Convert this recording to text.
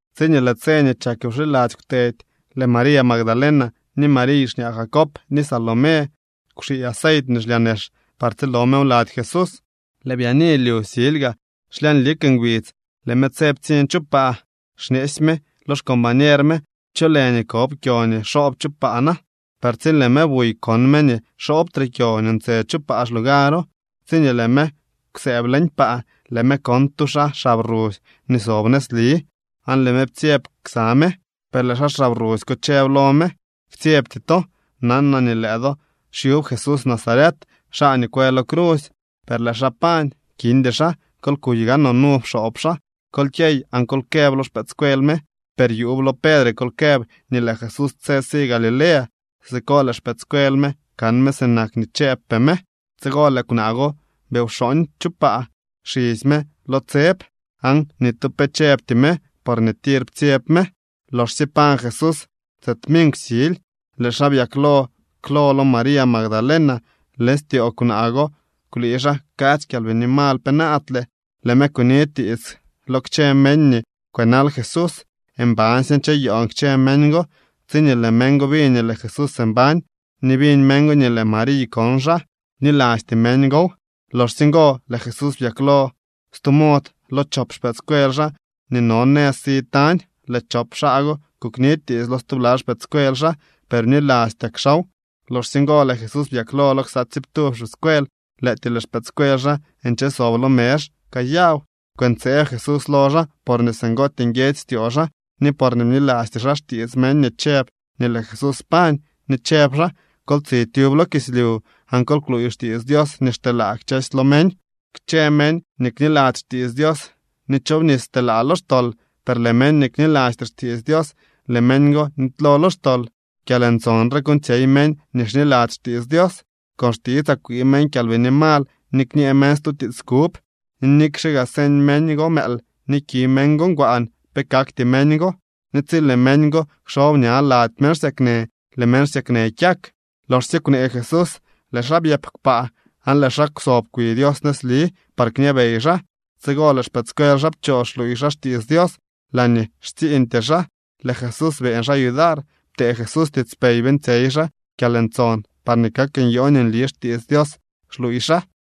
Tsiñee lëë tse nii chak wxiladzy kwtedy, lëë María Magdalena, ni Mariy xñaa Jacob, ni Salomé kwxii aceit nii xlyaa nex par tsilo mew lady Jesús. Lëë byaani lyu silyga, xlyañ lik ngbidz, lëë me tse ptsiñ chu paa. Xñeesy me lo xcombañer me: —¿Cho lë nii kob kyo nii xoob chu paa na? Per tsi lëë me buy, kon me nii xoobtre kyo nii ntse chu paa xlugaro. Tsiñee lëë me kwsëëb leñ paa, lëë me kon tu xaa xab rusy nii sob nëzli, aan lëë me ptsyeb ksa me. Per lëë xaa xab rusy ko chëb lo me: —Ktsyebty to. Nanaa nii lëë do xyub Jesús Nazaret, xaa nii kwë lo crusy. Per lëë xaa pañ, kindy xaa. Kol kuy gaanoo nu pxoob xaa. Kol kyey aan kol këb lo xpëëdscuel me, per yuub lo Pedre kol këb nii lëë Jesús tse si Galilea. Siko lëë xpëëdscuel me kan me sinak nii chëëbpee me. Tsigo lëë kwnaa go bi wxooñ chu paa xisy me lo tseb. Aan ni tu pe chëbty me, porñee tir ptsyeb me. Loxsye pañ Jesús tse tminkw sily, lëë xaa byaklo klo lo María Magdalena. Leñ styoo kwnaa go kwlii xaa kadzy kyalbini mal penaadle. Lëë me kuni tiits lo kchë meñ nii kwënal Jesús. Mbansye ncheyoon kchë meñ go. Tsiñee lëë meñ go biñ nii lëë Jesús mbañ, ni biñ meñ go nii lëë Mariy kon xaa, bnilasty meñ gow. Loxsye ngo lëë Jesús byaklo lo stu mod lo chop xpëëdscuel xaa nii no nëz si tañ. Lëë chop xaa go kukni tiits lo stubla xpëëdscuel xaa, per bnilastyak xaaw. Loxsye ngo lëë Jesús byaklo lo ksa tsiiptub xpëëdscuel. Lëëtyee lëë xpëëdscuel xaa nche sob lo mezh kayaw. Kwëntseeb Jesús lo xaa porñee singootyee nguiedzy styoo xaa ni porñee bnilasty xaa xtiits meñ nii chëb nii lëë Jesús pañ. Ni chëb xaa: —Kol tsi tyub lo kislyu aan kol kluuy xtiits Dios nii xteelaa kchësy lo meñ. Kchë meñ nii kniladzy xtiits Dios ni chobnis telaa lo xtol, per lëë meñ nii knilasty xtiits Dios, lëë meñ go nitylo lo xtol. Kyalntson re kuuñtsyey meñ nii xniladzy xtiits Dios: Con xtitsaa kwii meñ kyalbini mal ni kñee meñ stu tiits kub, ni nikxe gaa señ meñ go mëël ni ki meñ go ngwaan, pe kakty meñ go. Ni tsi lëë meñ go kxob ña lady meñ xsyaknë, lëë meñ xsyaknë kyak. Loxsye kwnee Jesús lëë xaa byëp kpaa aan lëë xaa kwsob kwi Dios nëzli par kñabey xaa. Tsigo lëë xpëëdscuel xaa pchoo xluuy xaa xtiits Dios laañee xtsiiñtyee xaa. Lëë Jesús beeñ xaa yudar. Ptee Jesús tiitspey beeñtsyey xaa kyalntson parñee kak nyoo nii nli xtiits Dios xluuy xaa.